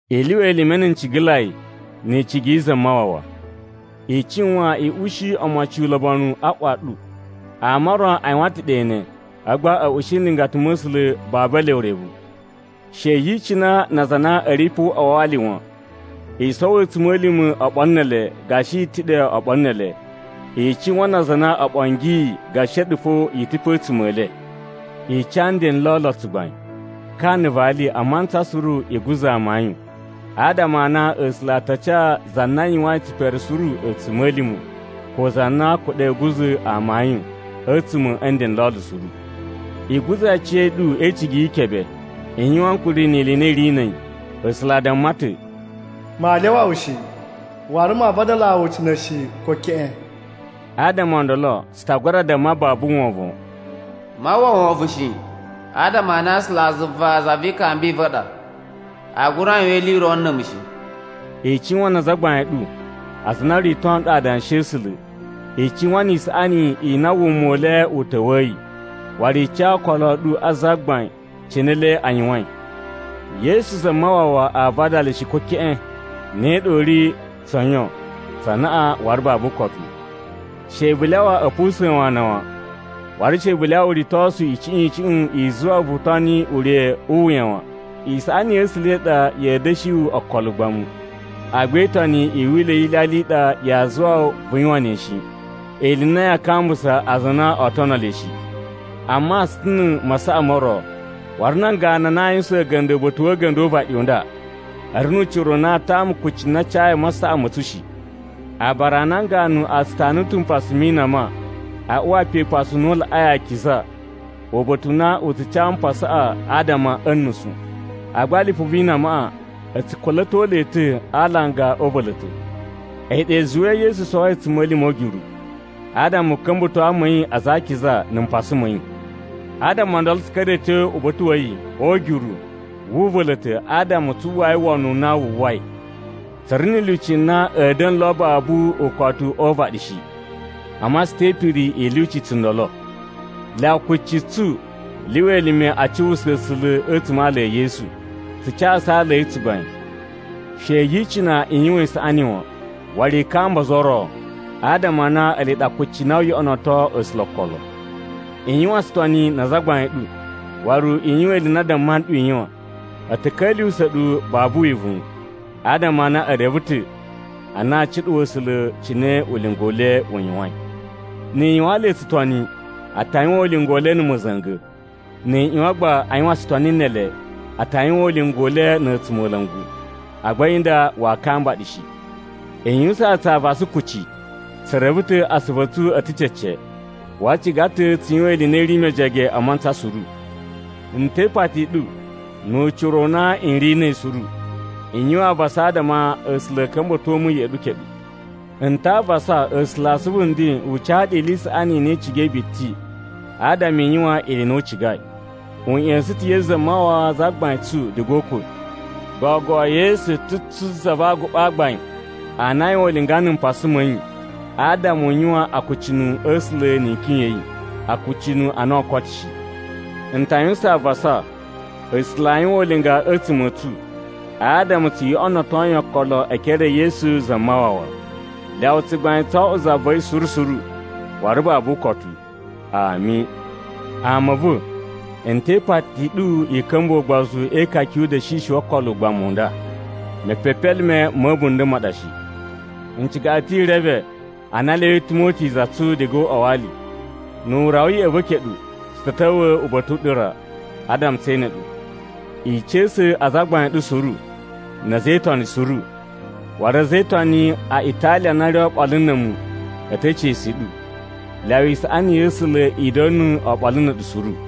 I lyuwa elime na̱ ncigalai ni icigi yi Zamawawa. I cuwan i ushi omocin ulobonu a ꞌwa ɗu. Ama o ro a yuwan ta̱ ɗe ne, a̱vu gba a̱ ushi nlingata ma̱ A̱sula̱ babu ele urevu. She yi icina na aza a na a̱ ri pe o uꞌwa wa ali wan. I sowo a̱tsuma̱lima̱ oɓolo ne ele gashi i ta̱ ɗe oɓolo ne ele. I cuwan na aza a na o ɓongiyi gashi a̱ɗu fo i ta̱ pe a̱tsuma̱ e le. I ca nden n lolo tsugbain. Ka na̱ vali a mantsa suru i guza̱ amayun, adama a na A̱sula̱ a ta ca za na yuwain tsipere suru a̱tsuma̱lima̱, ko za na kuɗa̱i a̱ guza̱ amayun a̱tsuma̱ a̱ nden n lolo suru. I guza̱ aciya̱ɗu e icigi yi ikebe. I yuwan ankuri ni ili i na i ri na̱ a̱yi. A̱sula̱ a damma ta̱, “Maa lyawa wu shi, waru maa vadalaa wu ucina̱ shi, ko keꞌen.” Adama o ndolo, tsu ta gura damma babu wovon, “Maa uwwa wovon shi, adama a na A̱sulazuva za vi ikambi i va̱ i ɗa. A gura yuwan ili i ro na̱ a̱mu shi.” I cuwan na azagbain a̱ ɗu, aza a na o rito nɗu Adanshi a̱ A̱sula̱. I cuwan ni isaꞌani i na wuma u le u ta̱wa̱yi, waru i ca okolo a̱ ɗu a Zagbain cine ele a yuwain. Yesu Zamawawa aa vadala shi, ko keꞌen! Ne ɗa u ri tso yon, tsa anaꞌan, waru babu ukotu. She vu lyawa a̱ pusa̱n wu ana wan, waru she vu lyawa uritosu icuꞌun icuꞌun i zuwa wu vu toni ure u wuya wan. Isaꞌani ya̱ A̱sula̱ i ɗa ya̱a̱ da̱shi wu okolo ugbamu, agba e itoni i wila̱ wi ilyalya i ɗa yaa zuwa wu vu yuwan ne shi, ili i na yaa kambusa aza a na oo tono le shi. Amma tsu ta̱ na̱ masaꞌa mo ro, waru nan ganu na a yuwusan a̱ga̱nda̱ uba̱ta̱ wa̱ a̱ga̱nda̱ o uvaɗi u nda, a̱ ri nu ucira u na a tama kucci na a cayi a masaꞌa ma̱ tsu shi. Aabara a nan ganu a tsu tanu ta̱ mpasa mi inama a uwa pe Upasu u na u Laꞌai Akiza uba̱ta̱ u na u tsu ca mpasaꞌa adama a̱ nusu. Agba lipu vi inamaꞌa a̱ tsu kula̱to le ta̱ a alanga o uva̱la̱ta̱. A̱yi ɗa i zuwai Yesu sowoi a̱tsuma̱lima̱ o ugyuru, adama u ka̱mba̱to ama a̱ yi aza a akiza na̱ mpasa ma̱ yi. Adama o ndolo tsu ka̱ra̱i a̱ tyo uba̱ta̱ wa̱ yi o ugyuru wu uva̱la̱ta̱ adama tsu uwwai wono u na wu uwwai. Tsu ri na̱ lyuci na a̱a̱ da̱na̱ lo babu ukotu o uvaɗi shi, amma tsu te ipiri i lyuci tsundolo. Lyawa kucci tsu lyuwa elime a cuwusa A̱sula̱ a̱tsuma̱ a ala e Yesu. Tsu casu ala a̱ yi tsugbain. She yi icina i yuwan isaꞌani wan, waru i kamba ozo o ro, adama a na ele ɗa kucci na oo yoꞌonoto A̱sula̱ okolo. I yuwan tsutoni na azagbain a̱ ɗu, waru i yuwan ili i na a damma nɗu i yuwan. A̱ ta̱ ka̱lyuwusa̱ ɗu babu wivuwun, adama a na e reve ta̱ a na aa cuɗuwa A̱sula̱ cine ulinga u le u yuwain. Ni i yuwaan le tsutoni, a ta yuwan ulinga u le na̱ ma̱za̱nga̱. Ni i ꞌyuwan gba a yuwan tsutoni ne ele, a ta yuwan ulinga u le na̱ a̱tsumola̱ngu, agba a̱yi nda waa kamba ɗu shi. I yuwusaan tsu avasa kuci. Tsu reve ta̱ asuvu a̱ tsu a̱ ta̱ cece, waru tsu ciga ta̱ tsu yuwan ili i na i ri mejege a mantsa suru. N te ipati i ɗu nu ucira u na n ri na̱ a̱yi suru, i yuwan avasa adama A̱sula̱ a̱ ka̱mba̱to mu ya̱ꞌa̱ ɗu keɗu. N ta avasa A̱sula̱ a asuvu nden u ca ɗu ili i saꞌani i na i cigai biti adama i yuwan ili i na u cigai. U ꞌya̱sa̱n ta̱ Yesu Zamawawa Zagbain tsu diga o ukwa̱. Gogo Yesu ta̱ tsu Za va Aguɓa a Gbain a na aa yuwan ulinga na̱ mpasa ma̱ yi adama a yuwan akucunu a̱ A̱sula̱ ni ikyon ya̱ yi, akucunu a na oo koto shi. N ta yuwusan avasa A̱sula̱ a yuwan ulinga a̱tsuma̱ a̱ tsu adama tsu yoꞌonoto yi okolo e ekere e Yesu Zamawawa. Lyawa tsugbain tso oꞌwo za va̱ yi suru suru waru babu ukotu. Ami. Ama a̱ va̱, n te ipati i ɗu i ka̱mbuwa̱ ugbozu e ikaka yu uda̱shishi wo okolo o ugbamu u nda. Mepepelime ma̱ a̱bunda̱ ma ɗa shi. N ciga ɗu ta̱ i reve a na a lyawai Timoti za tsu diga o uꞌwa wa ali. Nu u rawa ya̱ꞌa̱ va̱ keɗu, tsu ta̱ ta̱wa̱ uba̱ta̱ u ɗu ra adama tse ene ɗu. I ca̱sa̱ azagbain a̱ ɗu suru na̱ a̱za̱ e Itoni suru. Waru a̱za̱ e Itoni a Italiya a na a̱ ri oɓolo na̱ a̱mu a̱ te ica̱su i ɗu. Lyawa isaꞌani ya̱ A̱sula̱ i da̱na̱ oɓolo na̱ a̱ɗu suru.